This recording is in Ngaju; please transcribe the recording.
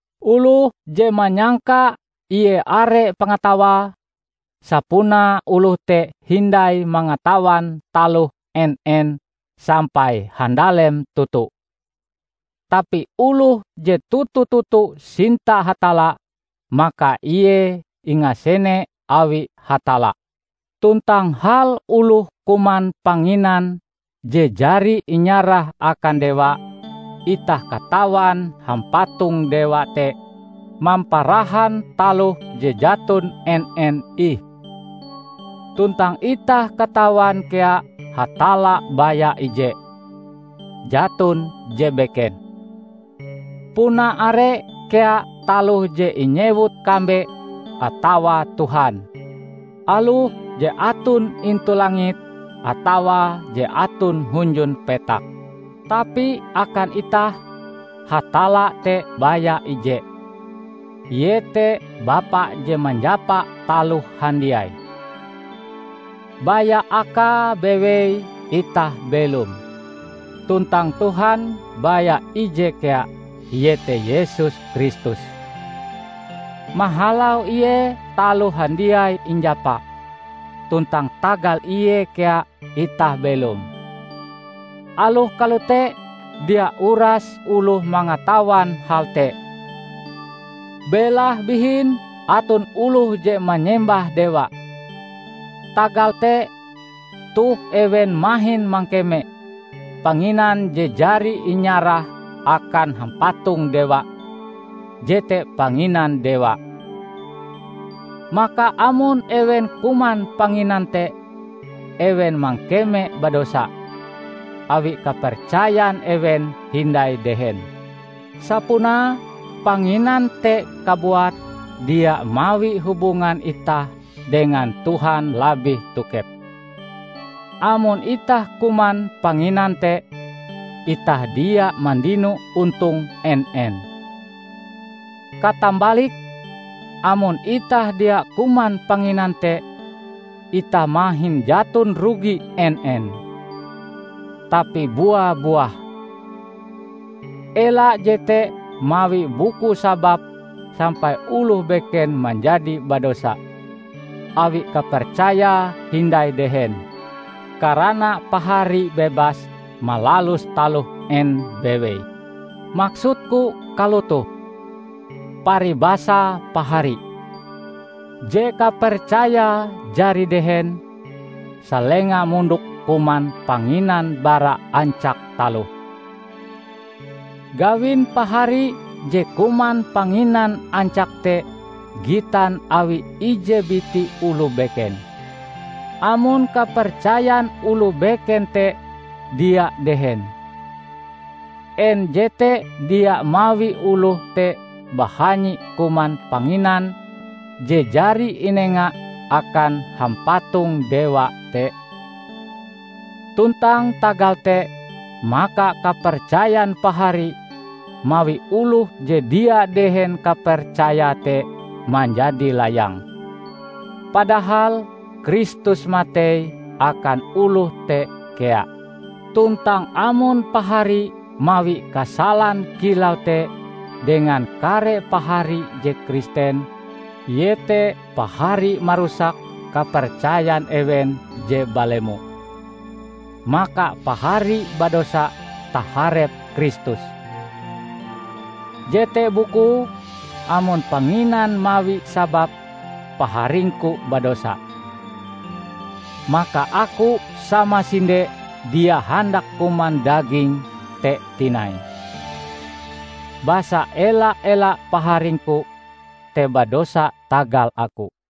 Oloh je manyangka ie are pangatawae, sapunae oloh te hindai mangatawan taloh en-en sampai handalem toto. Tapi oloh je toto-toto sinta Hatalla, maka ie ingasene awi Hatalla. Tuntang hal oloh kuman panginan je jari inyarah akan dewa, itah katawan hampatong-dewa te mamparahan taloh je jaton en-en ih. Tuntang itah katawan kea Hatalla baya ije; jaton je beken. Puna are kea taloh je inyewut kambe atawa tuhan; aloh je aton intu langit atawa je aton hunjun petak. Tapi akan itah, Hatalla te baya ije. Iete Bapa je manjapa taloh handiai. Baya Akae bewei itah belom. Tuntang Tuhan baya ije kea, iete Yesus Kristus. Mahalau Ie taloh handiai injapa, tuntang tagal Ie kea itah belom. Aloh kalote, dia uras oloh mangatawan hal te. Belahe bihin aton oloh je manyembah dewa. Tagal te, toh ewen mahin mangkeme panginan je jari inyarah akan hampatong-dewa, jete panginan dewa. Maka amon ewen kuman panginan te, ewen mangkeme badosa; awi kapercayan ewen hindai dehen. Sapunae panginan te kabuat dia mawi hubungan itah dengan Tuhan labih tokep. Amon itah kuman panginan te, itah dia mandino ontong en-en. Katambalike, amon itah dia kuman panginan te, itah mahin jaton rugi en-en. Tapi bua-buah! Ela jete mawi buku sabab sampai oloh beken manjadi badosa -- awi kapercayae hindai dehen -- karana pahari bebas malalus taloh en bewei. Maksudku kalotoh: Paribasae pahari, je kapercayae jari dehen, salenga mondok kuman panginan bara ancak taloh. Gawin pahari je kuman panginan ancak te gitan awi ije biti oloh beken. Amon kapercayan oloh beken te dia dehen, en jete dia mawi oloh te bahanyi kuman panginan je jari inenga akan hampatong dewa te? Tuntang tagal te maka kapercayan pahari mawi oloh je dia dehen kapercayae te manjadi layang. Padahal Kristus matei akan oloh te kea. Tuntang amon pahari mawi kasalan kilau te dengan kare pahari je Kristen -- iete pahari marusak kapercayan ewen je balemo -- maka pahari badosa taharep Kristus. Jete bukue, amon panginan mawi sabab paharingku badosa, maka aku samasinde dia handak kuman daging te tinai. Basa ela-ela paharingku te badosa tagal aku.